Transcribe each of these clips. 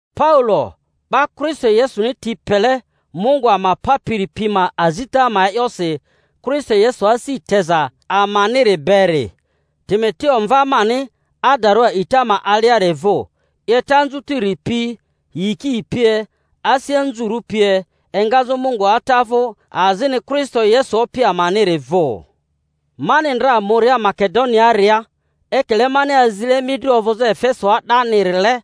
Paulo, 'ba Kristo Yesuni ti pele Mungu ama Papiri pi ma azita ma e'yosi Kristo Yesu asi teza amaniri beri, Timoteo, mva mani adarᴜ a'ita ma aliari vᴜ: 'Yeta anzutiri pi, yiki pie, asi anzurᴜ pie, engazᴜ Mungu Ata vᴜ azini Kristo Yesu Opi amaniri vᴜ. Mani ndra muria Makedoniaaria, ekile mani azile mi dri ovᴜzᴜ Efesoa 'danirile,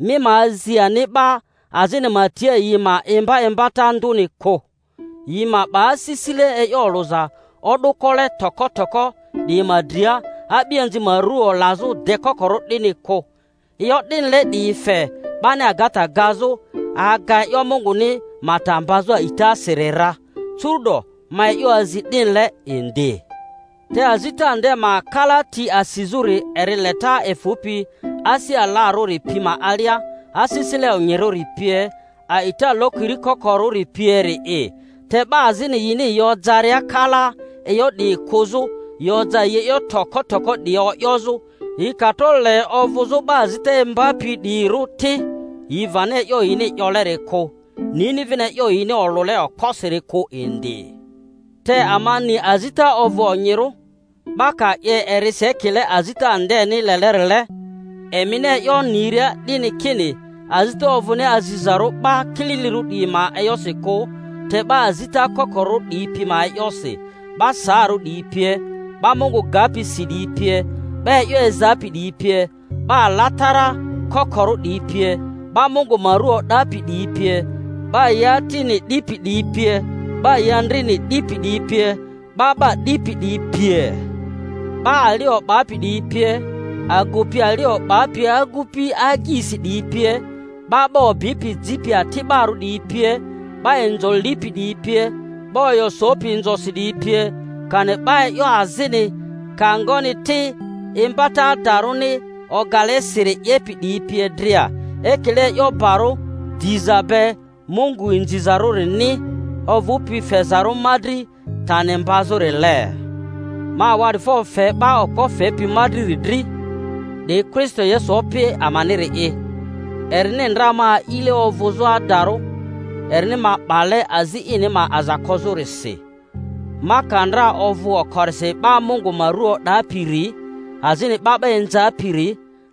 mi ma azi ani 'ba azini ma tia yi ma imba imbata ndᴜni kᴜ, yi ma 'ba asisile e'yo olᴜza o'dᴜko-le toko toko 'diyi ma dria, a'bianzi ma ru olazᴜ dekokorᴜ 'dini kᴜ; e'yo 'dinile 'diyi fe 'bani agata gazᴜ, aga e'yo Munguni ma ta mbazᴜ a'itasiri ra; curu'do ma e'yo azi 'dinile indi. Te azita nde ma kalati asizᴜri eri leta efᴜpi asi alarᴜri pi ma alia, asisile onyirᴜri pie, a'ita lokiri kokorᴜri pieri'i. Te 'ba azini yini yi ojaria kalaa e'yo 'diyi kᴜzᴜ, yi oja yi e'yo toko toko 'diyi o'yozᴜ; yi ka tro le ovᴜzᴜ 'ba azita imbapi 'diyirᴜ ti, yi vani e'yo yini 'yoleri kᴜ, nini vini e'yo yini olᴜle okposiri kᴜ indi. Te ama ni azita ovᴜ onyirᴜ, 'ba ka 'ye erisi ekile azita ndeni lelerile, emini e'yo niria 'dini kini azita ovᴜni azizarᴜ 'ba kililirᴜ 'diyi ma e'yosi kᴜ, te 'ba azita kokorᴜ 'diyi pi ma e'yosi, 'ba saarᴜ 'diyi pie, 'ba Mungu gapi si 'diyi pie, 'ba e'yo ezapi 'diyi pie, 'ba alatara kokorᴜ 'diyi pie, 'ba Mungu ma ru o'dapi 'diyi pie, 'ba yi atini 'dipi 'diyi pie, 'ba yi andrini 'dipi 'diyi pie, 'ba 'ba 'dipi 'diyi pie, 'ba ali o'bapi 'diyi pie, agupi ali o'bapi agupi agyisi 'diyi pie, 'ba 'ba obipi jipi ati'barᴜ 'diyi pie, 'ba inzo lipi 'diyi pie, 'ba oyo sopi inzosi 'diyi pie, kani 'ba e'yo azini—ka ngoni ti —imbata adarᴜni ogale siri 'yepi 'diyi pie dria; ekile e'yo barᴜ diza be Mungu inzizarᴜrini, ovᴜpi fezarᴜ ma dri tani mbazᴜrile. Ma awa'difo fe 'ba okpo fepi ma driri dri, 'di Kristo Yesu Opi amaniri'i, erini ndra ma a'ile ovᴜzᴜ adarᴜ, erini ma 'bale azi ini ma aza kozᴜrisi, ma ka ndra ovᴜ oko-risi 'ba Mungu ma ru o'dapiri, azini 'ba 'ba inzapiri,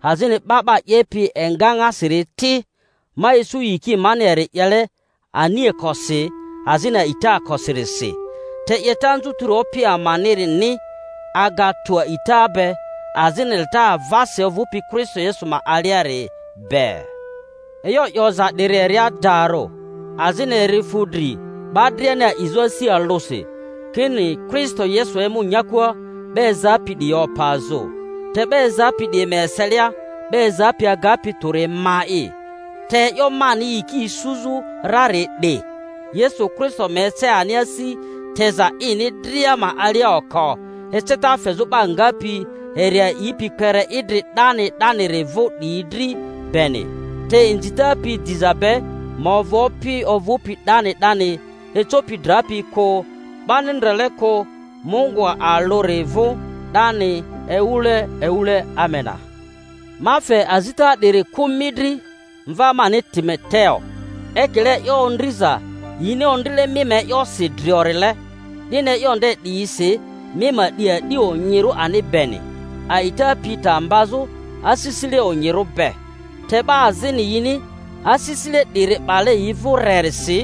azini 'ba 'ba 'yepi egaŋasiri ti; ma isu yiki mani eri 'yele aniakosi azini a'itaakosirisi, te 'yeta anzutiri Opi amanini aga tᴜ a'ita be azini leta avasi ovᴜpi Kristo Yesu ma aliari be. E'yo 'yoza 'diri eri adarᴜ, azini eri fu dri 'ba driani a'izᴜ asi alᴜsi, kini Kristo Yesu emu nyakua 'ba ezapi 'diyi opazᴜ. Te 'ba ezapi 'diyi ma eselia 'ba ezapi agapi tᴜri ma'i; te e'yo mani yiki isuzᴜ rari 'di, Yesu Kristo ma ece ani asi teza ini dria ma alia oko, eceta fezᴜ 'ba ngapi eri a'ipi kpere idri 'dani 'daniri vᴜ 'diyi dri beni. Te inzita pi diza be ma ovᴜ Opi ovᴜpi 'dani 'dani, ecopi drapi kᴜ, 'bani ndrele kᴜ, Mungu alᴜri vᴜ, 'dani ewule ewule. Amena. Ma fe azita 'diri kᴜ mi dri, mva mani Timoteo, ekile e'yo ondriza yini ondrile mi ma e'yosi driorile, 'dini e'yo nde 'diyisi mi ma 'di 'adi onyirᴜ ani beni, a'ita pi ta mbazᴜ asisile onyirᴜ be. Te 'ba azini, yini asisile 'diri 'bale yi vᴜ rerisi,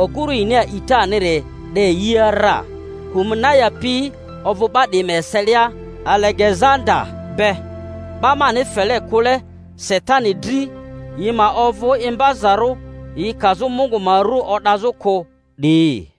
oguru yini a'itaniri 'de yia ra; Humenayo pi ovᴜ 'ba 'diyi ma eselia Alegezanda be, 'ba mani fele kule Satani dri, yi ma ovᴜ imbazarᴜ yi kazᴜ Mungu ma ru o'dazᴜ kᴜ 'diyi.